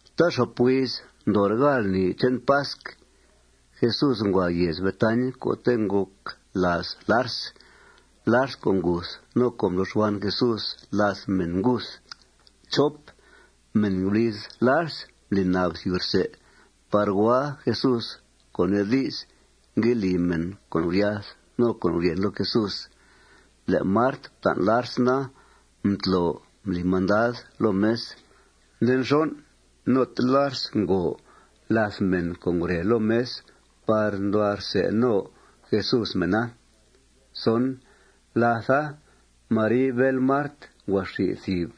Taaxop huiz ndoore' gáal lni che'n pasc, Jesús ngua yèez Betañ co'te' ngòc làaz Lars, Lars co' nguth no co' mblo xban Jesús làth mèn nguth. Mèn guliz Lars mbli nab thìb rsè par hua Jesús, co' nee di's, ngue li mèn con' guryath no con' guryèn loo Jesús. Le' Mart fta'n Lars na, mtlo mbli mandad loo mes. Nde nxon', note Lars ngòo làth mèn co' ngure loo mes par nduhua rsè no Jesús mèna. Látha, Mari, bél Mart, ngua xi thìb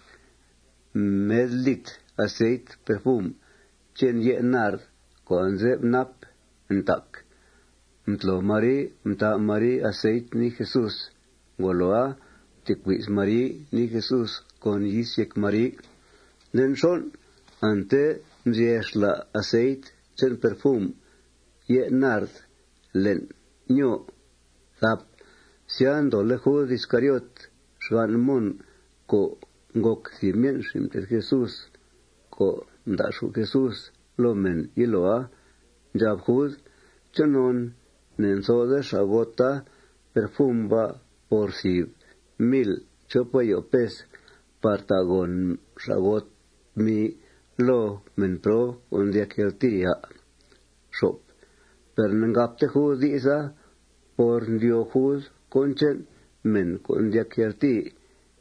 med litr aceit perfum che'n ye' nard co' anze'f náp ntac. Mtlo Mari, mtà Mari aceita nii Jesús. Ngoloa, mtecui's Mari nii Jesús con yis yéc Mari. Nde nxon', ante mzyè xla' aceit che'n perfum ye' nard le'n nyòo. Sya, ndoole' Jud Iscariot, xgan' Mon, co' ngòc thìb myen' xin' mté'th Jesús co' mda'xù' Jesús loo mèn yiloa, ndxab Jud: ―¿Chonon ne'ntho'de xa'gota perfum ba' por thìb mil chop ayo pes par ta' gòn xa'got tmi loo mèn prob co' ndyac yaltìi, à'? Per ne'ngabte Jud di'sa por mdyóo Jud cón che'n mèn co' ndyac yaltìi.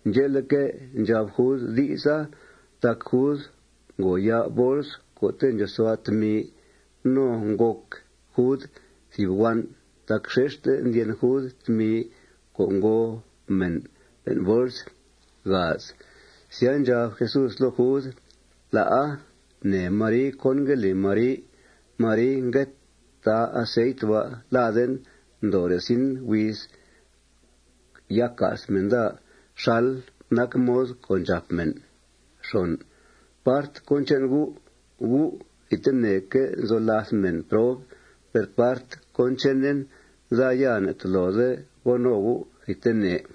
Ndxe'leque', ndxab Jud di'sa tac Jud ngo ya' bols co'te' ndxòosua' tmi. No ngòc Jud thìb huan' tac xexte ndyen Jud tmi co' ngòo mèn le'n bols. Sya, ndxab Jesús loo Jud: ―La'a. Nee Mari cón ngue li Mari. Mari ngue tà aceit ba' laden ndoore' zin huiz ya ca's mèn daa xal nac mod co' ndxàp mèn. Part cón che'n gu', gu' thidteneque' nzo làth mèn prob. Per part cón chenen, daa ya ne'tolode go no gu' thidtene.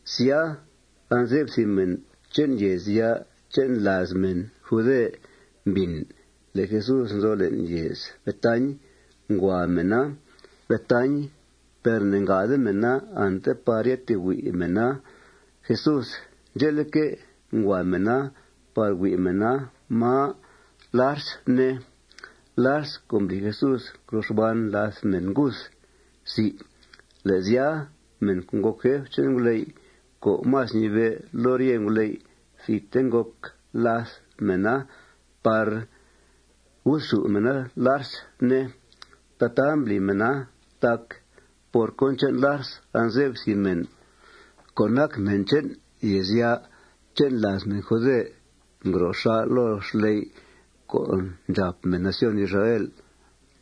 Sya, anze'f thìb mèn che'n yèezya' che'n làaz mèn jude mbìn le' Jesús nzo le'n yèez Betañ. Ngua mèna Betañ. Per ne'ngade mèna ante par ya tee hui' mèna Jesús. Ndxe'leque', ngua mèna par hui' mèna máa Lars, ne, Lars co' mbli Jesús ngro xban làth mèn nguth. Le' sya, mèn co' ngòc jef che'n nguley' co' más ñibe' loo rye nguley', thidte ngòc làth mèna par guthxù' mèna Lars, ne. Tataa mbli mèna tac por cón che'n Lars anze'f thìb mèn co' nac mèn che'n yèezya' che'n làaz mèn jude ngro xà' loo xley' co' ndxàp mèn nación Israel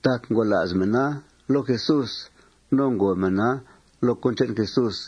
tac ngola's mèna loo Jesús no ngòo mèna loo cón che'n Jesús.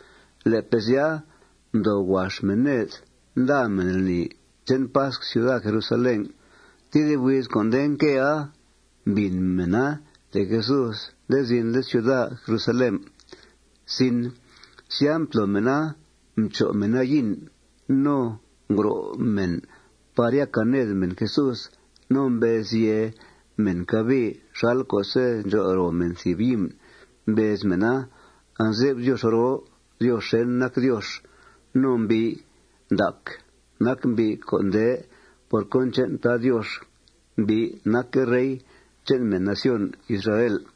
Le'pe' sya, mdoo huax mèn ned. Nda mèn lni che'n pasc ciuda Jerusalén. Tedib huiz co' nde nquea, mbìn mèna le' Jesús nde zinle' ciuda Jerusalén. Sya, mtlo mèna, mcho' mèn yin. No ngro' mèn par ya càa ned mèn Jesús. No mbez yèe mèn cabii xal co'se' ndxol ro mèn thìb himn. Mbez mèna: ―Anze'f Diox roo Diox xèn nac Diox. No mbi' ndac nac mbi' co' nde por cón che'n Tad Diox. Mbi' nacque' rey che'n mèn nación Israel.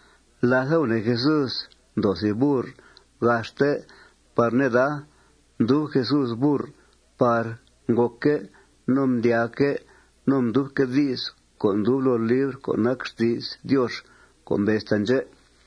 Látha, gunèe Jesús mdoo thìb burr gaxte par neda. Mdub Jesús burr par ngòcque' no mdyaaque' no mdyubque' di's co' ndub loo libr co' nac xti's Diox co' mbez taandxè':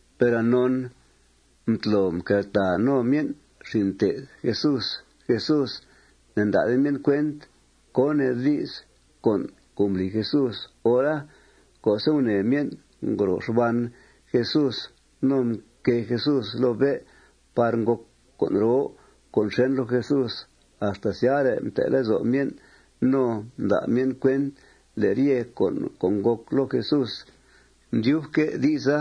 Per anon mtlo mqueltàa no myen' xin' mté'th Jesús Jesús, ne'nda'de myen' cuent cón nee di's con' co' mbli Jesús hora. Co'se' gunèe myen' ngro xban Jesús no mquée Jesús loo bé' par ngòc con' roo con' xèn loo Jesús, axta syare' mte' lezo' myen' no mda' myen' cuent le' ryete con' co' ngòc loo Jesús, mdyubque' di'sa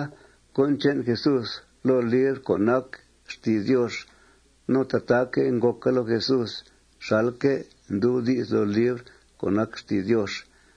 cón che'n Jesús loo libr co' nac xti's Diox. No tataaque' ngòca loo Jesús xalque' ndub di's loo libr co' nac xti's Diox.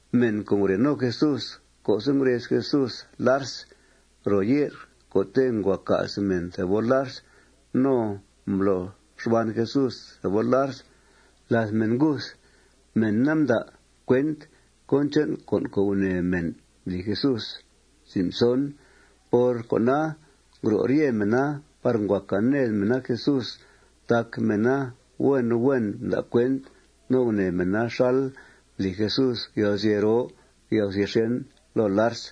Mèn co' ngure no Jesús co'se' ngurez Jesús Lars ro ye'r co'te' ngua ca's mèn thebol Lars no mblo xban Jesús thebol Lars làth mèn nguth, mèna mda' cuent cón che'n con' gunèe mèn mbli Jesús. Por cona, ngro' rye mèna par ngua càa ned mèna Jesús tac mèna huen huen mda' cuent no gunèe mèna xal mbli Jesús yalguzye' roo yalguzye' xèn loo Lars.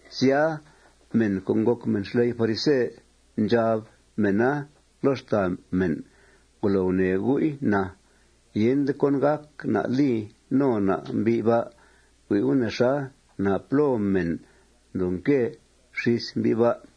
Sya, mèn co' ngòc mèn xley' farise, ndxab mèna loo xtàa mèn: ―Ngolo gunèe gu'i, na. Yende cón gác na' li no na' mbi' ba'. Hui' gu' nexa. ¡Napló mèn ndoo nque xís mbi' ba'!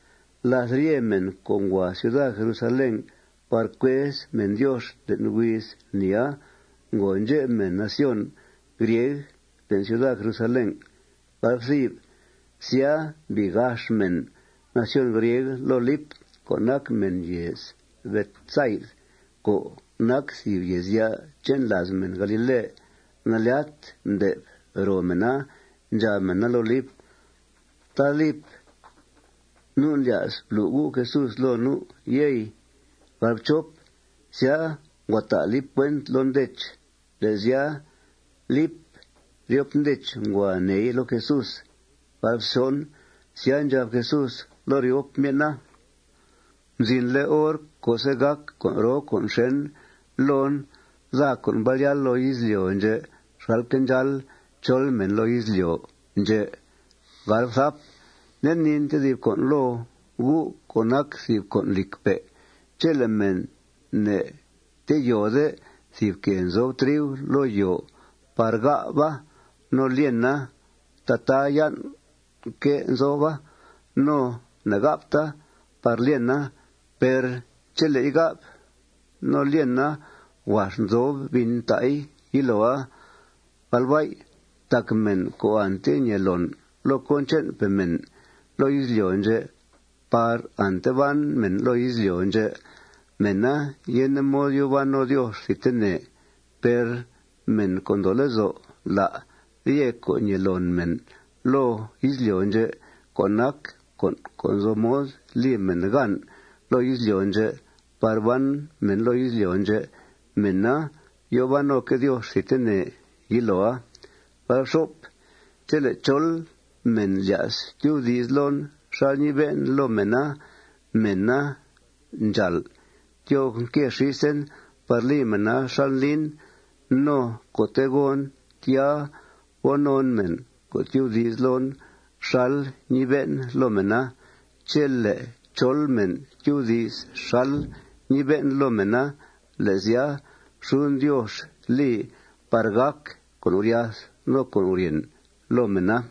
Làth rye mèn co' ngua ciuda Jerusalén par cuez mèn Diox le'n huiz lnia, ngo ndxep mèn nación Grieg le'n ciuda Jerusalén. Sya, mbii gax mèn nación Griega loo Lip co' nac mèn yèez Betsaid co' nac thìb yèezya' che'n làaz mèn galile. Nalyat mdè'f ro mèna. Ndxab mèna loo Lip: ―Tad Lip, nu' ndlya's blu' U' Jesús loo nu', yey. Sya, ngua ta' Lip cuenta loo Ndech. Le' sya, Lip ryop Ndech ngua neei loo Jesús. Sya, ndxab Jesús loo ryop myen'a: ―Mzinle' hor co'se' gàc con' roo con' xèn loon, daa co' mbal yáal loo izlyo' ndxè' xalque' ndxáal chol mèn loo izlyo' ndxè'. Nde niin tedib con' loo gu' co' nac thìb con' lìcpe': Chele' mèn ne'teyòode thìb quèe nzob triu loo yòo par gà'ba no lyena, taate yan' quèe nzoba. No ne'gà'bta par lyena. Per chele'i gà'b no lyena, huax nzob bin ta'i yiloa. Tac mèn co' ante ñee loon loo cón che'npe' mèn loo izlyo' ndxè' par ante ban mèn loo izlyo' ndxè', mèna yende mod yòo ban no Diox thidtene. Per mèn co' ndoo lezo' lá' rye con' ñee loon mèn loo izlyo' ndxè', co' nac con' co' nzo mod li mèn gan loo izlyo' ndxè par ban mèn loo izlyo' ndxè', mèna yòo ban noque' Diox thidtene yiloa. Chele' chol mèn lya's tyubdi's loon xal ñibe'en loo mèna, mèna ndxàal tyoo nque xísen par li mèna xal ndlin. No co'te' gon, tya go non mèn co' tyubdi's loon xal ñibe'en loo mèna. Chele' chol mèn tyubdi's xal ñibe'en loo mèna, le' sya, xuden Diox li par gàc con' guryath no con' guryèn loo mèna.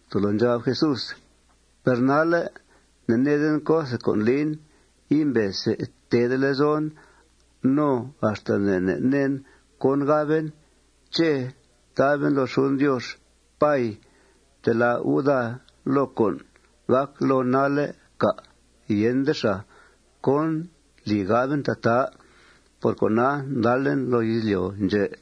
Tolo ndxab Jesús: ―Per nalle' ne'needen co'the con' lin. Imbe see teede lezon. No axta ne' ne' neen cón gaben. ¿Ché' taben loo xuden Diox: Pay, ftelá' U' daa loo con' gàc loon nalle', cà'? Yende xàa. ¿Cón li gaben tataa? Por cona, ndalen loo izlyo' ndxè'.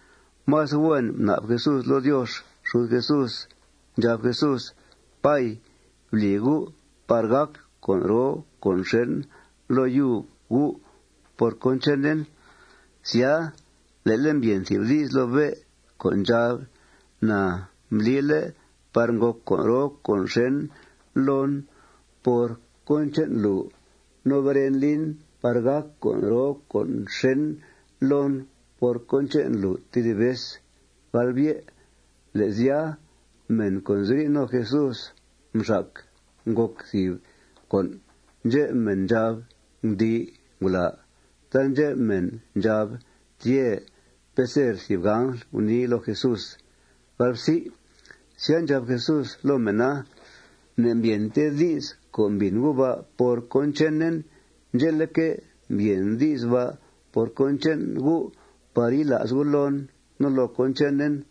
Más huen mna'b Jesús loo Diox xud Jesús. Ndxab Jesús: ―Pay, bli U' par gàc con' roo con' xèn loo yub U' por cón chenen. Sya, le'le' mbyèn thìb di's loo bé' co' ndxab: ―Na mblile' par ngòc con' roo con' xèn loon por cón che'n lùu. No beren lin par gàc con' roo con' xèn loon por cón che'n lùu tedib vez. Le' sya, mèn co' nziri' no Jesús mxac ngòc thìb con'. Ndxep mèn ndxab: ―Gundii ngulàa. Taandxep mèn ndxab: ―Tyè'. Peser thìb angl gunii loo Jesús. Sya, ndxab Jesús loo mèna: ―Ne'mbyènte di's co' mbìn gu' ba' por cón chenen. Ndxe'leque', mbyèn di's ba' por cón che'n gu' par yila's gu' loon no loo cón chenen.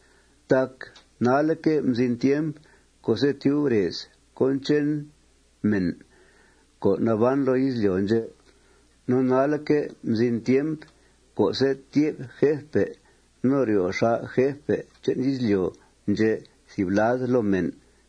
Tac nalle'que' mzin tiemp co'se' tyub rez cón che'n mèn co' naban loo izlyo' ndxè'. No nalle'que' mzin tiemp co'se' tyè'b jefpe' no ryo' xà' jefpe' che'n izlyo' ndxè' thìb lad loo mèn.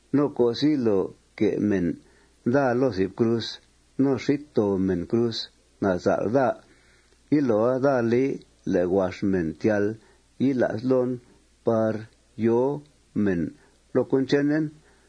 No co'se' yilo que' mèn daa loo thìb cruz, no xít too mèn cruz nasal' daa, yiloa daa li le' huax mèn tyal yila's loon par yòo mèn loo cón chenen.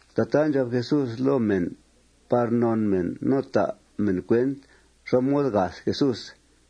Tataa ndxab Jesús loo mèn par non mèn no ta' mèn cuent xá mod gath Jesús.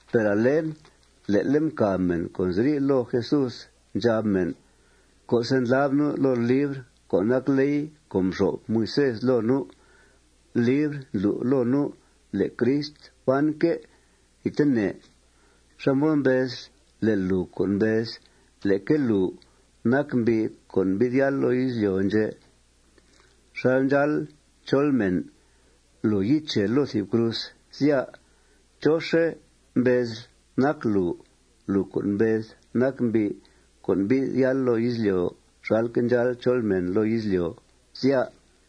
Per ale le'le' mcàb mèn co' nziri' loo Jesús. Ndxab mèn: ―Co'se' ndlab nu' loo libr co' nac ley co' mxo'f Moisés loo nu', libr ndlu' loo nu' le' Crist banque' thidtene. ¿Xá mod mbezl le' lùu co' mbez leque lùu nac mbi' co' mbi'th yáal loo izlyo' ndxè' xal ndxáal chol mèn, lùu yiche loo thìb cruz, sya? ¿Chóxe' mbezl nac lùu, lùu co' mbez nac mbi' co' mbi'th yáal loo izlyo' xalque' ndxáal chol mèn loo izlyo', sya?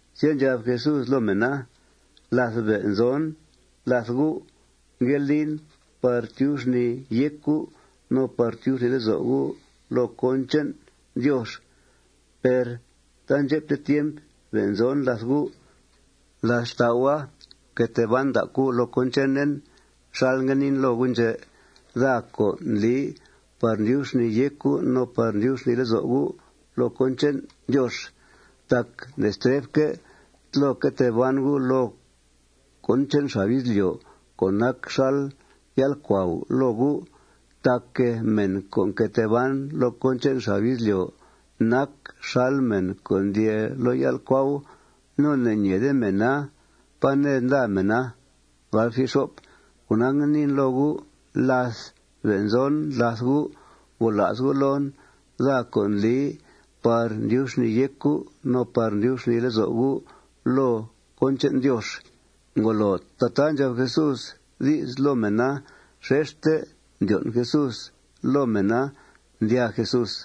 Sya, ndxab Jesús loo mèna: ―Láth be' nzon làth gu', ngue lin par tyub xnìi yéc gu' no par tyub xnìi lezo' gu' loo cón che'n Diox. Per taandxepte tiemp be' nzon làth gu'. Làth xtau'a, fque tee ban ndac gu' loo cón chenen xal ngue niin loo gu' ndxè, daa co' ndli par ndyub xnìi yéc gu' no par ndyub xnìi lezo' gu' loo cón che'n Diox. Tac ne'stre'fque' tlo que tee ban gu' loo cón che'n xab izlyo' co' nac xal yál'cuau loo gu'. Tac mèn co' nque tee ban loo cón che'n xab izlyo' nac xal mèn co' ndyee loo yál'cuau. No ne'ñeede mèna pá ned nda mèna. Cona, ngue niin loo gu': Láth be' nzon làth gu', gola's gu' loon, daa co' ndli par tyub xnìi yéc gu' no par tyub xnìi lezo' gu' loo cón che'n Diox. Ngolo tataa ndxab Jesús di's loo mèna, xexte mdyon' Jesús loo mèna. Ndyàa Jesús.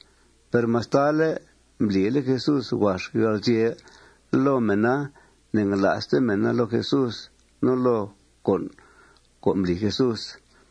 Per mastale' mblile' Jesús huax yalguzye' loo mèna, ne'ngala'ste mèna loo Jesús no loo con' co' mbli Jesús.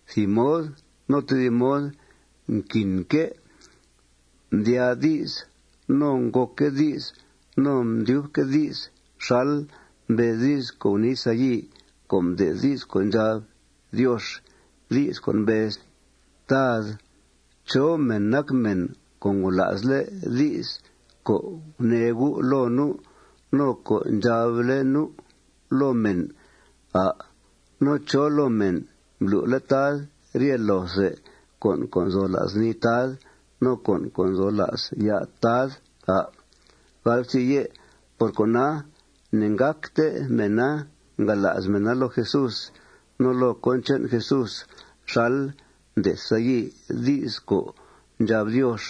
Thìb mod no tedib mod mquinque' mdyaa di's, no ngòcque' di's, no mdyubque' di's xal mbez di's co' gunii Sayi co' mde'th di's co' ndxab Diox, di's co' mbez: Tad, ¿chó mèn nac mèn co' ngola'sle' di's co' gunee U' loo nu' co' ndxable' nu' loo mèn, à'? No ¿chó loo mèn mblu'le' Tad rye loothe con' co' nzo la's nii Tad no con' co' nzo la's ya' Tad, à'? Por cona, ne'ngácte mèna ngala's mèna loo Jesús no loo cón che'n Jesús xal mde'th Sayi di's co' ndxab Diox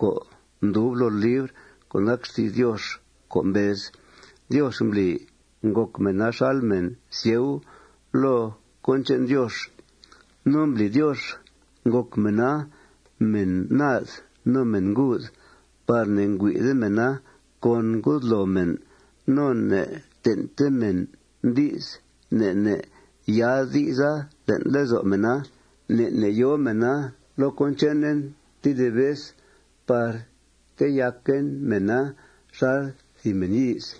co' mdub loo libr co' nac xti's Diox co' mbez: Diox mbli ngòc mèna xal mèn sieu loo cón che'n Diox. No mbli Diox ngòc mèna mèn naad no mèn nguud par ne'hui'de mèna con ngudloo mèn no ne'ten'te mèn di's, ne' ne' yaa'd di'sa le'n lezo' mèna. Ne' ne' yòo mèna loo cón chenen tedib vez par teyaquen mèna xal thìb mèn yíiz.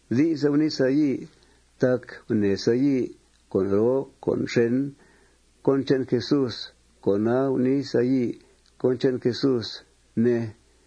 Di'sa gunii Sayi tac gunèe Sayi con' roo con' xèn cón che'n Jesús. Con'a, gunii Sayi cón che'n Jesús, ne.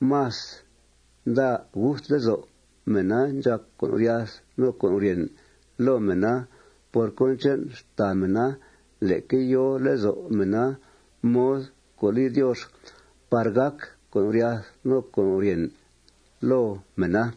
Más nda' gust lezo' mèna ndxàc con' guryath no con' guryèn loo mèna por cón che'n xtàa mèna leque yòo lezo' mèna mod co' li Diox par gàc con' guryath no con' guryèn loo mèna.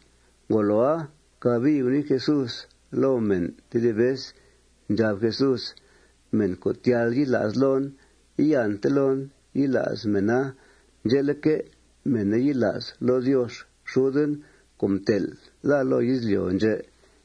Ngoloa, cabii gunii Jesús loo mèn tedib vez. Ndxab Jesús: ―Mèn co' tyal yila's loon, iante loon yila's mèna. Ndxe'leque', mèna yila's loo Diox xuden co' mtel' daa loo izlyo' ndxè'.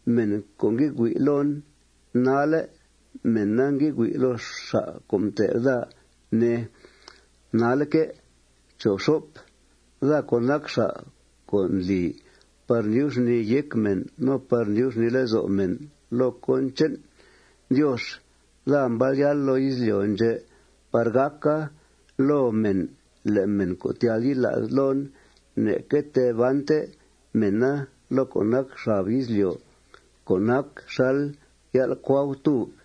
Mèn co' ngue hui' loon nalle', mèna ngue hui' loo xa' co' mtel' daa, ne, nalle'que'. Daa co' nac xa' co' ndli par ndyub xnìi yéc mèn no par ndyub xnìi lezo' mèn loo cón che'n Diox, daa mbal yáal loo izlyo' ndxè' par gàca loo mèn le' mèn co' tyal yila's loon, ne'que tee bante mèna loo co' nac xab izlyo' co' nac xal yál'cuautúb.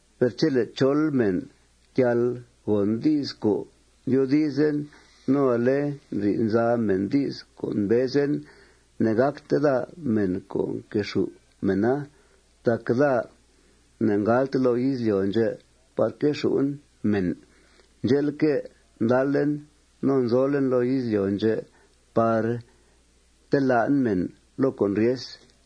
Per chele' chol mèn ndyal gòn di's co' ndyoodizen, no ale ndri'th nza mèn di's co' mbezen, ne'gàcte daa mèn co' quexù' mèna. Tac daa ne'ngalte loo izlyo' ndxè' par quexù'en mèn. Ndxe'leque', ndalen no nzolen loo izlyo' ndxè' par telá'en mèn loo con' ryes.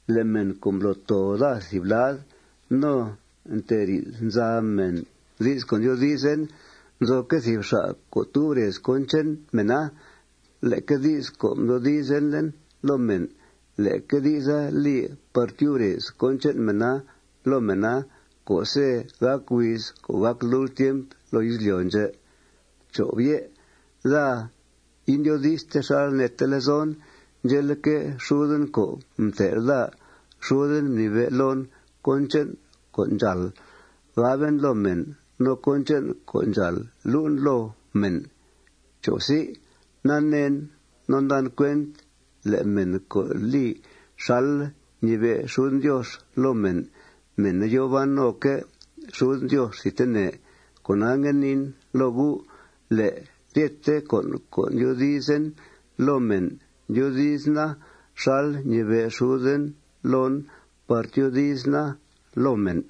Le' mèn co' mblo' too daa thìb lad no nteri'th nza mèn di's co' ndyoodizen, nzoque' thìb xa' co' tub rez cón che'n mèna. Leque di's co' mdoodizlen loo mèn, leque di'sa li par tyub rez cón che'n mèna loo mèna co'se' gàc huiz co' gàc lult tiemp loo izlyo' ndxè'. Daa indyoodi'ste xal neete lezon. Ndxe'leque', xuden co' mtel' daa, xuden mnibe' loon cón che'n co' ndxàal gaben loo mèn no cón che'n co' ndxàal lu'en loo mèn. Naneen no ndan cuent le' mèn co' li xal ñibe' xuden Diox loo mèn, mèna yòo ban noque' xuden Diox thidtene. Cona, ngue niin loo gu': Le' ryete con' co' ndyoodizen loo mèn, ndyoodizena xal ñibe' xuden loon par tyoodizena loo mèn.